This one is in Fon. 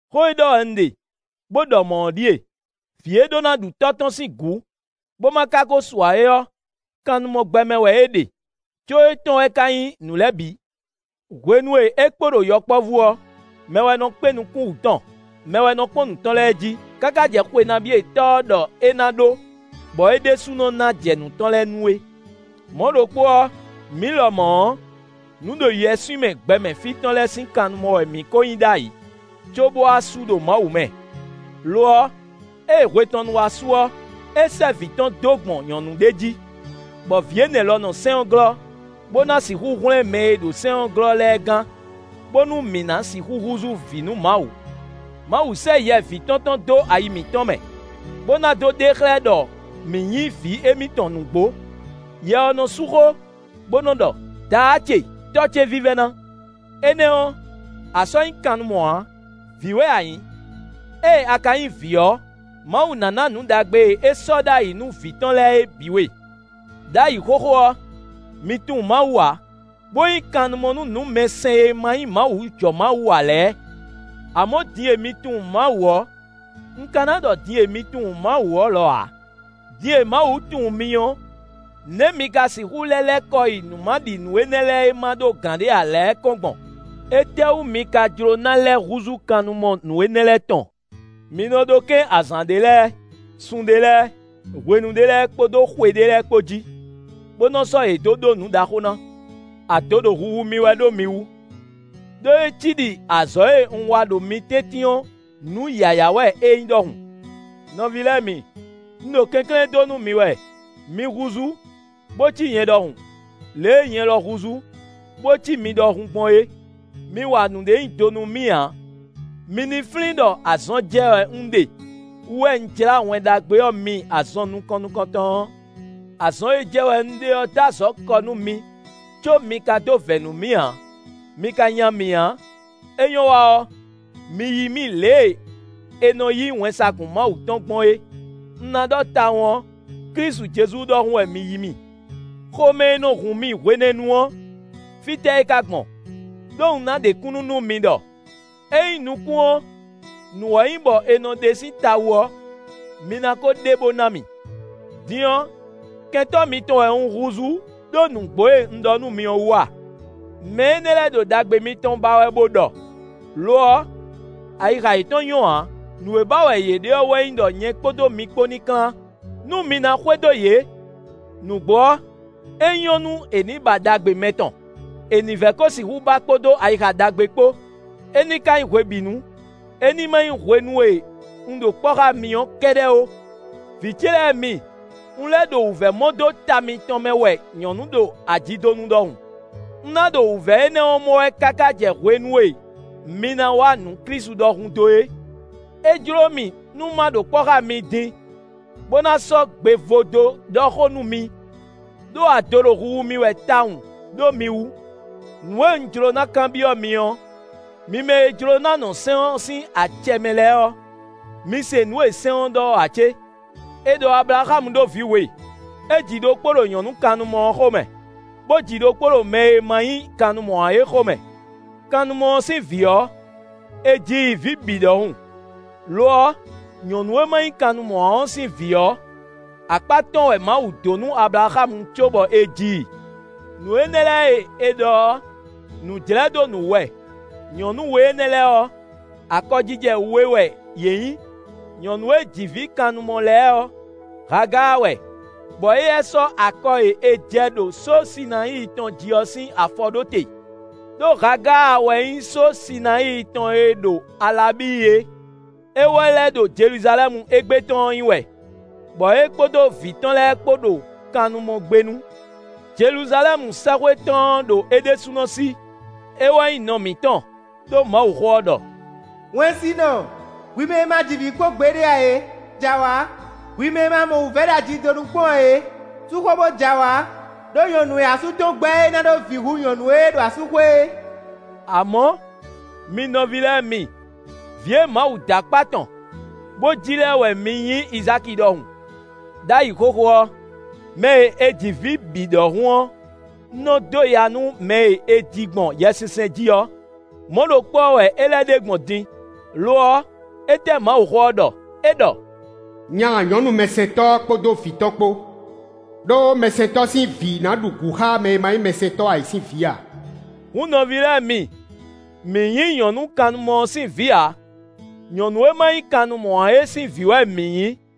Xó e ɖɔ wɛ un ɖe, bó ɖɔ mɔ̌ ɔ́ ɖíe: vǐ e ɖó ná ɖu tɔ́ tɔn sín gǔ, bó má ka ko su ǎ é ɔ́, kannumɔ gbɛ mɛ wɛ é ɖe, có étɔn wɛ ka nyí nǔ lɛ́ɛ bǐ. Hwenu e é kpo ɖo yɔkpɔ́vú ɔ́, mɛ wɛ nɔ kpé nukún wǔ tɔn; mɛ wɛ nɔ kpɔ́n nǔ tɔn lɛ́ɛ jí káká jɛ xwe nabí e tɔ́ ɔ́ ɖɔ é ná ɖó, bɔ é ɖésúnɔ ná jɛ nǔ tɔn lɛ́ɛ nu é. Mɔ̌ ɖokpó ɔ́, mǐ lɔmɔ̌ ɔ́, nǔɖoyɛswímɛ gbɛmɛ fí tɔn lɛ́ɛ sín kannumɔ wɛ mǐ ko nyí ɖ'ayǐ, cóbó wá su ɖo Mawu mɛ. Lo ɔ́, ée hwe tɔn nu wá su ɔ́, é sɛ́ vǐ tɔn dó gbɔn nyɔ̌nu ɖé jí, bɔ vǐ énɛ́ lɔ nɔ sɛ́n ɔ́ glɔ́, bó ná sixú hwlɛ́n mɛ e ɖo sɛ́n ɔ́ glɔ́ lɛ́ɛ gán, bónú mǐ ná sixú húzú vǐ nú Mawu. Mawu sɛ́ yɛ vǐ tɔn tɔn dó ayi mǐtɔn mɛ, bó ná dó ɖe xlɛ́ ɖɔ mǐ nyí vǐ émítɔn nǔgbó. Yɛ ɔ́ nɔ sú xó, bó nɔ́ ɖɔ: “Daá ce! Tɔ́ ce vívɛ́ná!” Énɛ́ ɔ́, a sɔ́ nyí kannumɔ ǎ; vǐ wɛ a nyǐ. Ée a ka nyí vǐ ɔ́, Mawu ná ná nǔ ɖagbe e é sɔ́ ɖ'ayǐ nú vǐ tɔn lɛ́ɛ é bǐ we. Đ'ayǐ xóxó ɔ́, mi tunwun Mawu ǎ, bó nyí kannumɔ nú nǔmɛsɛn e ma nyí Mawu jɔ Mawu ǎ lɛ́ɛ. Amɔ̌ din e mi tunwun Mawu ɔ́, un ka ná ɖɔ din e mi tunwun Mawu ɔ́ lɔ ǎ; din e Mawu tunwun mi ɔ́, nɛ̌ mi ka sixú lɛ́ lɛ́ kɔ yi nǔmaɖinǔ énɛ́ lɛ́ɛ e má ɖó gǎn ǎ lɛ́ɛ kɔn gbɔn? Étɛ́wú mi ka jló ná lɛ́ húzú kannumɔ nǔ énɛ́ lɛ́ɛ tɔn? Mi nɔ ɖó kɛ́n azǎn ɖé lɛ́ɛ, sun ɖé lɛ́ɛ, hwenu ɖé lɛ́ɛ kpódó xwe ɖé lɛ́ɛ kpó jí, bó nɔ sɔ́ yě dó ɖó nǔ ɖaxó ná. Ado ɖo huhu mì wɛ ɖó mi wú; ɖó é cí ɖi azɔ̌ e un wa ɖo mi tɛ́ntin ɔ́ nǔ yǎyá wɛ é nyí ɖɔhun. Nɔví lɛ́ɛ mi, un ɖo kɛnklɛ́n dó nú mi wɛ; mi húzú, bó cí nyɛ ɖɔhun, lě e nyɛ lɔ húzú, bó cí mi ɖɔhun gbɔn é. Mi wa nǔɖé nyi do nú mì ǎ. Mi ní flín ɖɔ azɔn jɛ wɛ un ɖe wú wɛ un jlá Wɛn Ɖagbe ɔ́ mi azɔn nukɔn nukɔntɔn ɔ́. Azɔn e jɛ wɛ un ɖe ɔ́ dó azɔ̌ kɔ nú mi có mi ka dó vɛ̌ nú mì ǎ; mi ka nya mì ǎ; é nyɔ́ wa ɔ́, mi yí mì lě e è nɔ yí wɛnsagun Mawu tɔn gbɔn é. Un ná ɖɔ tawun ɔ́, Klísu Jezu ɖɔhun wɛ mi yí mì. Xomɛ e nɔ hun mi hwenɛ́nu ɔ́, fítɛ́ é ka gbɔn? Đó un ná ɖe kúnnu nú mi ɖɔ: ényí nukún ɔ́, nǔ wɛ nyí bɔ è nɔ ɖe sín ta wú ɔ́, mi ná ko ɖe bó ná mì. Din ɔ́, kɛntɔ́ mitɔn wɛ un húzú ɖó nǔgbó e un ɖɔ nú mi ɔ́ wú a? Mɛ énɛ́ lɛ́ɛ ɖo ɖagbe mitɔn ba wɛ bó ɖɔ, lo ɔ́, ayixa yětɔn nyɔ́ ǎ. Nǔ e ba wɛ yě ɖe ɔ́ wɛ nyí ɖɔ nyɛ kpódó mi kpó ní klán, nú mi ná xwedó yě. Nǔgbó ɔ́, é nyɔ́ nú è nǐ ba ɖagbe mɛtɔn; è nǐ vɛ kó sixú ba kpódó ayixa ɖagbe kpó, é ní ka nyí hwebǐnu; é ní má nyí hwenu e un ɖo kpɔ́ xá mi ɔ́ kɛ́ɖɛ́ ó. Vǐ ce lɛ́ɛ mi, un lɛ́ ɖo wǔvɛ́ mɔ dó ta mitɔn mɛ wɛ nyɔ̌nu ɖo ajidonu ɖɔhun. Un ná ɖo wǔvɛ́ énɛ́ ɔ́ mɔ wɛ káká jɛ hwenu e mi ná wa nǔ Klísu ɖɔhun dó é. É jló mì nú má ɖo kpɔ́ xá mi din, bó ná sɔ́ gbe vo dó ɖɔ xó nú mi; ɖó ado ɖo huhu mì wɛ tawun ɖó mi wú. Nǔ e un jló ná kanbyɔ́ mi ɔ́, mi mɛ e jló ná nɔ sɛ́n ɔ́ sín acɛ mɛ lɛ́ɛ ɔ́, mi se nǔ e sɛ́n ɔ́ ɖɔ ɔ́ ǎ cé? È ɖɔ Ablaxámu ɖó vǐ we; é ji ɖokpó ɖo nyɔ̌nu kannumɔ ɔ́ xomɛ, bó ji ɖokpó ɖo mɛ e ma nyí kannumɔ ǎ é xomɛ. Kannumɔ ɔ́ sín vǐ ɔ́, è ji i vǐ bǐ ɖɔhun. Lo ɔ́, nyɔ̌nu e má nyí kannumɔ ǎ ɔ́ sín vǐ ɔ́, akpá tɔn wɛ Mawu dǒ nú Ablaxámu cóbɔ è ji i. Nǔ énɛ́ lɛ́ɛ e è ɖɔ ɔ́, nǔ jlɛ́ dó nǔ wú wɛ. Nyɔ̌nu we énɛ́ lɛ́ɛ ɔ́, akɔjijɛ we wɛ yě nyí. Nyɔ̌nu e ji vǐ kannumɔ lɛ́ɛ ɔ́, Hagáa wɛ, bɔ éyɛ́ sɔ́ akɔ e è jɛ ɖo só Sinayíi tɔn jí ɔ́ sín afɔ ɖó te. Đó Hagáa wɛ nyí só Sinayíi tɔn e ɖo Alabíi é. É wɛ lɛ́ ɖo Jeluzalɛ́mu égbé tɔn ɔ́ nyí wɛ, bɔ é kpódó vǐ tɔn lɛ́ɛ kpó ɖo kannumɔgbénu. Jeluzalɛ́mu sɛ́xwé tɔn ɔ́ ɖo é ɖésúnɔ sí; é wɛ nyí nɔ mǐtɔn. Đó Mawuxó ɔ́ ɖɔ: “Wɛnsinɔ, hwi mɛ e ma ji vǐ kpɔ́n ǎ é, jɛ awǎ; hwi mɛ e ma mɔ wǔvɛ́ ɖo ajidonu kpɔ́n ǎ é, sú xó bó jɛ awǎ; ɖó nyɔ̌nu e asú tɔn gbɛ́ e ná ɖó vǐ hú nyɔ̌nu e ɖo asúxwé é.” Amɔ̌ mi nɔví lɛ́ɛ mi! Vǐ e Mawu dó akpá tɔn bó ji lɛ́ɛ wɛ mi nyí Izáki ɖɔhun. Đ'ayǐ xóxó ɔ́, mɛ e è ji vǐ bǐ ɖɔhun ɔ́ nɔ dó ya nú mɛ e è ji gbɔn Yɛsinsɛn jí ɔ́; mɔ̌ ɖokpó ɔ́ wɛ é lɛ́ ɖe gbɔn din. Lo ɔ́, étɛ́ Mawuxó ɔ́ ɖɔ? É ɖɔ: “Nya nyɔ̌nu mɛsɛntɔ́ ɔ́ kpódó vǐ tɔn kpó; ɖó mɛsɛntɔ́ sín vǐ ná ɖu gǔ xá mɛ e ma nyí mɛsɛntɔ́ ǎ é sín vǐ ǎ.” Hǔn nɔví lɛ́ɛ mi! Mǐ nyí nyɔ̌nu kannumɔ ɔ́ sín vǐ ǎ; nyɔ̌nu e má nyí kannumɔ ǎ é sín vǐ wɛ mǐ nyí.